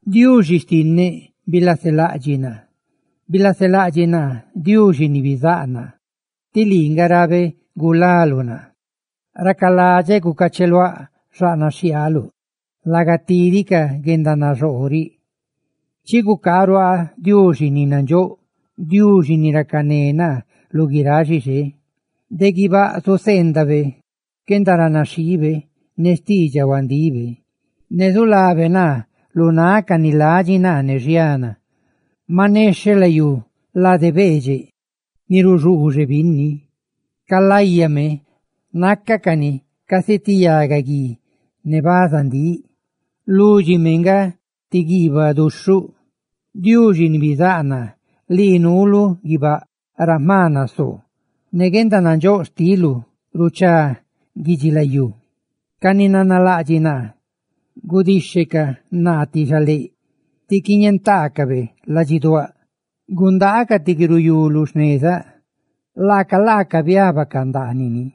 Diuxi xtinneꞌ bilaselaꞌdxiꞌ naa, bilaselaꞌdxiꞌ naa Diuxi ni bizáꞌ naa, tí lii nga rabeꞌ gulaluꞌ naa. Racaladxeꞌ gucacheluáꞌ xaꞌnaꞌ xhiaaluꞌ laga tidi ca guendanaxoo riꞌ. Chi gucaaꞌ ruaaꞌ Diuxi ni nandxóꞌ, Diuxi ni racané naa lu guiráꞌ xixé. De guibáꞌ zuseendabe xquendaranaxhiibe ne xtiidxaꞌ huandibe, ne zulabe naa lu náꞌ ca ni ladxi naa ne xiana. Maꞌ nexheꞌ layú, lade beedxeꞌ ni ruxuuxe binni; ca láyame, nácacani casi ti yagaguí ne bazandíꞌ, lúdxime nga ti guiibaꞌ duxhuꞌ. Diuxi ni bizáꞌ naa, lii nuulu guibáꞌ ra jma nasoo. ¡Ne guendanandxóꞌ xtiluꞌ ruchá guidxilayú! Ca ni nanalaꞌdxiꞌ naa gudixhecaꞌ naa ti xaléꞌ ti quiñentaacabe ladxiduáꞌ; gundaacaꞌ ti guiruyú lu xnezaꞌ, laaca laaca biabacaꞌ ndaanini.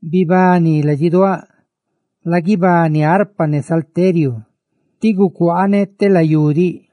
Bibani, ladxiduáꞌ; laguibani, arpa ne salteriu; ¡tí gucuaaneꞌ telayú diꞌ!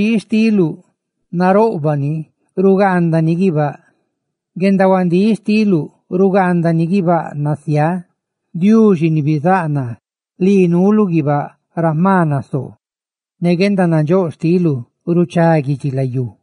Guendaranaxhii xtiluꞌ naroꞌbaꞌ ni rugaandani guibáꞌ; guendahuandíꞌ xtiluꞌ rugaandani guibáꞌ nasiáa. Diuxi ni bizáꞌ naa, lii nuuluꞌ guibáꞌ ra jma nasoo. ¡Ne guendanandxóꞌ xtiluꞌ ruchá guidxilayú!